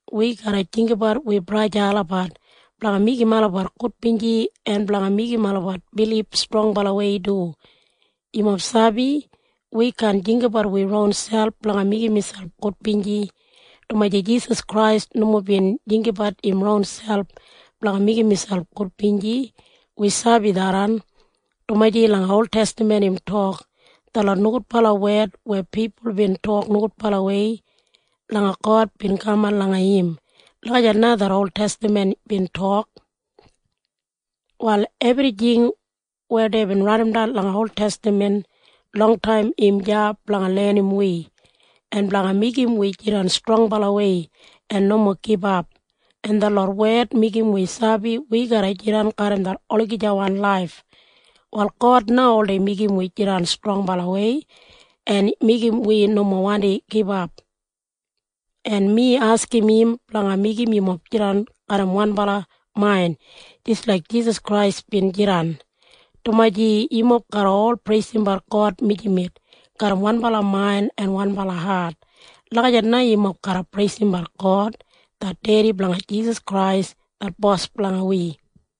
Wi garra jinggabat wi braja en sista olabat blanga meigim olabat gudbinji en blanga meigim olabat bilib strongbalawei du. Yumob sabi? Wi kaan jinggabat wi ronselp blanga meigim miselp gudbinji, dumaji Jisas Krais nomo bin jinggabat im ronselp blanga meigim miselp gudbinji. Wi sabi tharran, dumaji langa oltestaman im tok, “Detlot nogudbala wed weya pipul bin tok nogudbalawei langa God bin kaman langa im.” Lagijat na det oltestaman bin tok. Wal ebrijing weya deibin raidimdan langa oltestaman longtaim im deya blanga lenim wi en blanga meigim wi jidan strongbalawei en nomo gibap, en detlot wed meigim wi sabi wi garra jidan garram det olagijawan laif. Wal God na oldei meigim wi jidan strongbalawei en meigim wi nomo wandi gibap. En mi askim im blanga meigim yumob jidan garram wanbala main jis laik Jisas Krais bin jidan, dumaji yumob garra ol preisimbat God mijamet garram wanbala main en wanbala hat. Lagijat na yumob garra preisimbat God det Dedi blanga Jisas Krais det Bos blanga wi.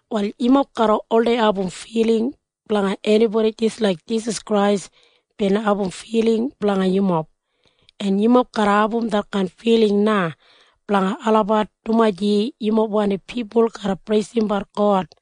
Wal yumob garra oldei abum filing blanga enibodi jis laik Jisas Krais bin abum filing blanga yumob, en yumob garra abum detkain filing na blanga olabat dumaji yumob wandim pipul garra preisimbat God.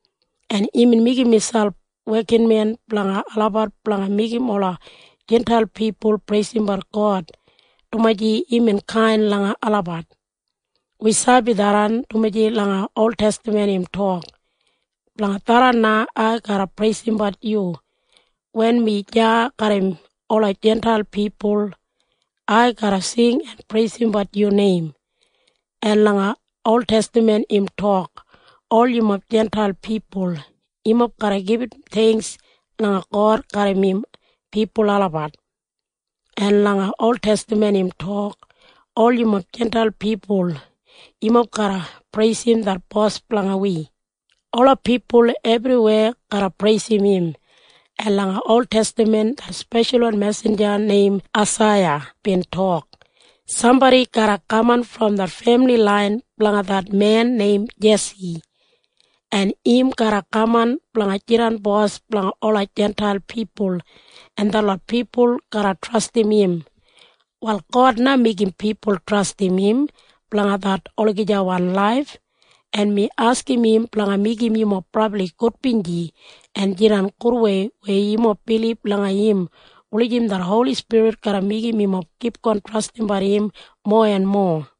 En imbin meigim imselp wekinmen blanga olabat blanga meigim ola Jintail pipul preisimbat God dumaji imbin kain langa olabat. Wi sabi tharran, dumaji langa oltestaman im tok, “Blanga tharran na ai garra preisimbat yu wen mi deya garram ola Jintail pipul. Ai garra sing en preisimbat yu neim.” En langa oltestaman im tok, “Ol yumob Jintail pipul, yumob garra gibit theingks langa God garram im pipul olabat.” En langa oltestaman im tok, “Ol yumob Jintail pipul, yumob garra preisim det Bos blanga wi. Ola pipul ebriweya garra preisim im.” En langa oltestaman det speshalwan mesinja neim Aisaiya bin tok, “Sambodi garra kaman brom det femili lain blanga det men neim Jesi, en im garra kaman blanga jidan bos blanga ola Jintail pipul, en detlot pipul garra trastim im.” Wal God na meigim pipul trastim im blanga det olagijawan laif, en mi askim im blanga meigim yumob brabli gudbinji en jidan gudwei weya yumob bilib langa im wulijim det Holi Spirit garra meigim yumob kipgon trastim im mowa en mowa.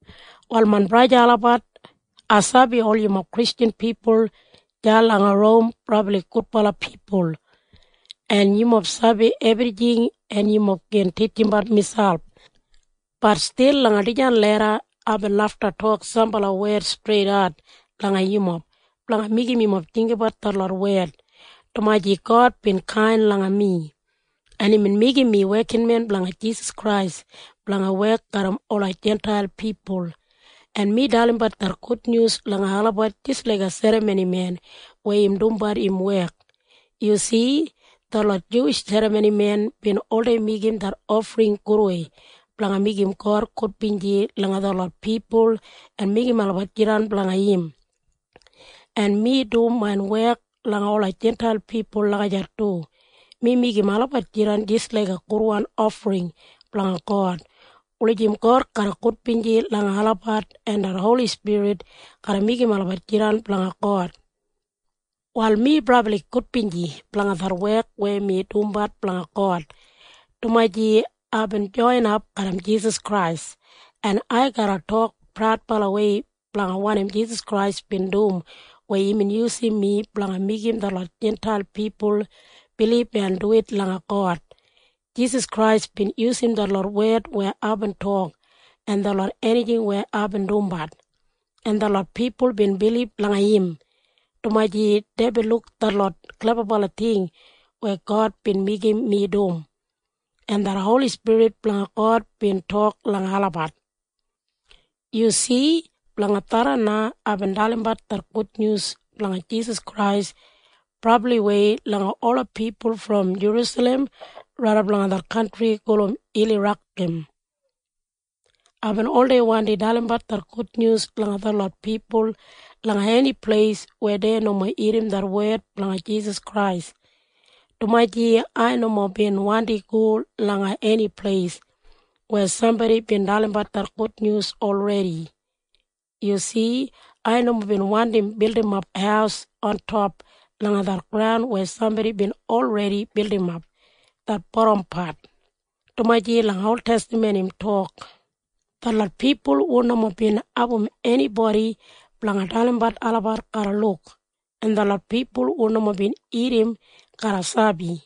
Wal main braja en sista olabat, ai sabi ol yumob Kristjan pipul deya langa Rom brabli gudbala pipul en yumob sabi ebrijing en yumob gin titjimbat miselp. Bat stil langa dijan leda aibin lafta tok sambala wed streidat langa yumob blanga meigim yumob jinggabat detlot wed, dumaji God bin kain langa mi, en imbin meigim mi wekinmen blanga Jisas Krais blanga wek garram ola Jintail pipul, en mi dalimbat det gudnyus langa olabat jis laiga serramonimen weya im dumbat im wek. Yu si? Detlot Juwish serramonimen bin oldei meigim det ofring gudwei blanga meigim God gudbinji langa detlot pipul en meigim olabat jidan blanga im. En mi dum main wek langa ola Jintail pipul lagijat du. Mi meigim olabat jidan jis laiga gudwan ofring blanga God wulijim God garra gudbinji langa olabat en det Holi Spirit garra meigim olabat jidan blanga God. Wal mi brabli gudbinji blanga det wek weya mi dumbat blanga God, dumaji aibin joinap garram Jisas Krais. En ai garra tok praudbalawei blanga wanim Jisas Krais bin dum weya imbin yusum mi blanga meigim detlot Jintail pipul bilib en duwit langa God. Jisas Krais bin yusum detlot wed weya aibin tok en detlot enijing weya aibin dumbat. En detlot pipul bin bilib langa im dumaji deibin luk detlot klebabala ting weya God bin meigim mi dum, en det Holi Spirit blanga God bin tok langa olabat. Yu si? Blanga tharran na aibin dalimbat det gudnyus blanga Jisas Krais brabliwei langa ola pipul brom Jerusalem raidap langa det kantri gulum Ilirakam. Aibin oldei wandi dalimbat det gudnyus langa detlot pipul langa eni pleis weya dei nomo irrim det wed blanga Jisas Krais, dumaji ai nomo bin wandi go langa eni pleis weya sambodi bin dalimbat det gudnyus olredi. Yu si? Ai nomo bin wandim bildimap haus ontop langa det graun weya sambodi bin olredi bildimap det bodampat, dumaji langa oltestaman im tok, “Detlot pipul hu nomo bin abum enibodi blanga dalimbat olabat garra luk, en detlot pipul hu nomo bin irrim garra sabi.”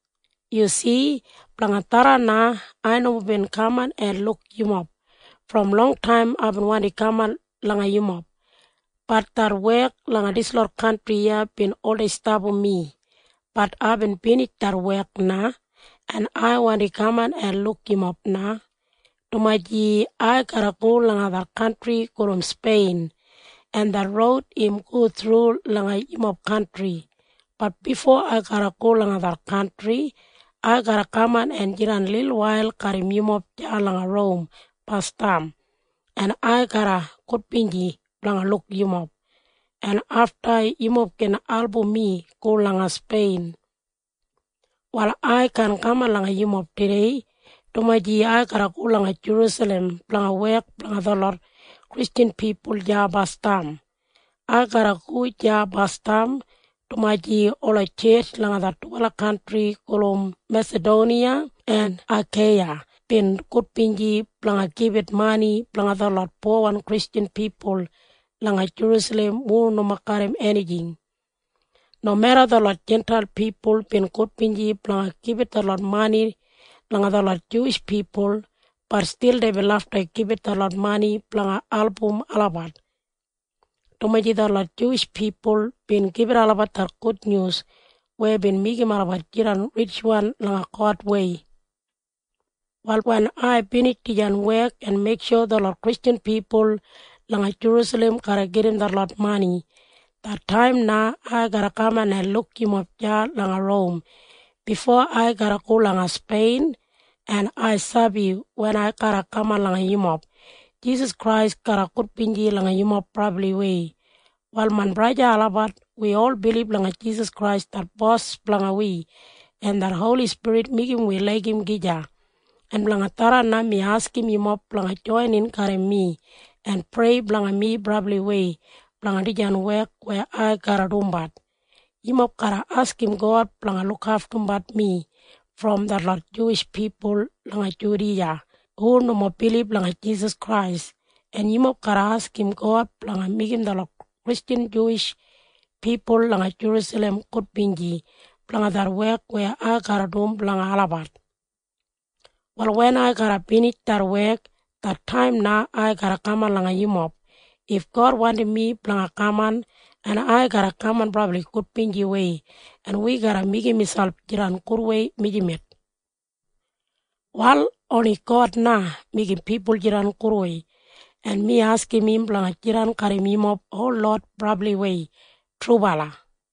Yu si? Blanga tharran na ai nomo bin kaman en luk yumob. Brom longtaim aibin wandi kaman langa yumob. Bat det wek langa dislot kantri iya bin oldei stapam mi. Bat aibin binij det wek na, en ai wandi kaman en luk yumob na, dumaji ai garra go langa det kantri gulum Spein, en det roud im go thru langa yumob kantri. Bat bifo ai garra go langa det kantri, ai garra kaman en jidan lilwail garram yumob deya langa Rom basdam, en ai garra gudbinji blanga luk yumob, en afta yumob gin album mi go langa Spein. Wal ai kaan kaman langa yumob tudei, dumaji ai garra go langa Jerusalem blanga wek blanga detlot Kristjan pipul deya basdam. Ai garra go deya basdam dumaji ola tjetj langa det dubala kantri gulum Mesadoniya en Akeiya bin gudbinji blanga gibit mani blanga detlot powan Kristjan pipul langa Jerusalem hu nomo garram enijing. Nomeda detlot Jintail pipul bin gudbinji blanga gibit detlot mani langa detlot Juwish pipul, bat stil deibin lafta gibit detlot mani blanga album olabat, dumaji detlot Juwish pipul bin gibit olabat det gudnyus weya bin meigim olabat jidan ritjwan langa Godwei. Wal wen ai binij dijan wek en meiksho detlot Kristjan pipul langa Jerusalem garra gedim detlot mani, det taim na ai garra kaman en luk yumob deya langa Rom bifo ai garra go langa Spein. En ai sabi wen ai garra kaman langa yumob, Jisas Krais garra gudbinji langa yumob brabliwei. Wal main braja en sista olabat, wi ol bilib langa Jisas Krais det Bos blanga wi, en det Holi Spirit meigim wi laigim gija. En blanga tharran na mi askim yumob blanga joinin garram mi en prei blanga mi brabliwei blanga dijan wek weya ai garra dumbat. Yumob garra askim God blanga lukaftumbat mi brom detlot Juwish pipul langa Judiya hu nomo bilib langa Jisas Krais. En yumob garra askim God blanga meigim detlot Kristjan Juwish pipul langa Jerusalem gudbinji blanga det wek weya ai garra dum blanga olabat. Wal wen ai garra binij det wek, det taim na ai garra kaman langa yumob if God wandim mi blanga kaman. En ai garra kaman brabli gudbinjiwei, en wi garra meigim miselp jidan gudwei mijamet. Wal oni God na meigim pipul jidan gudwei, en mi askim im blanga jidan garram yumob holot brabliwei. Trubala.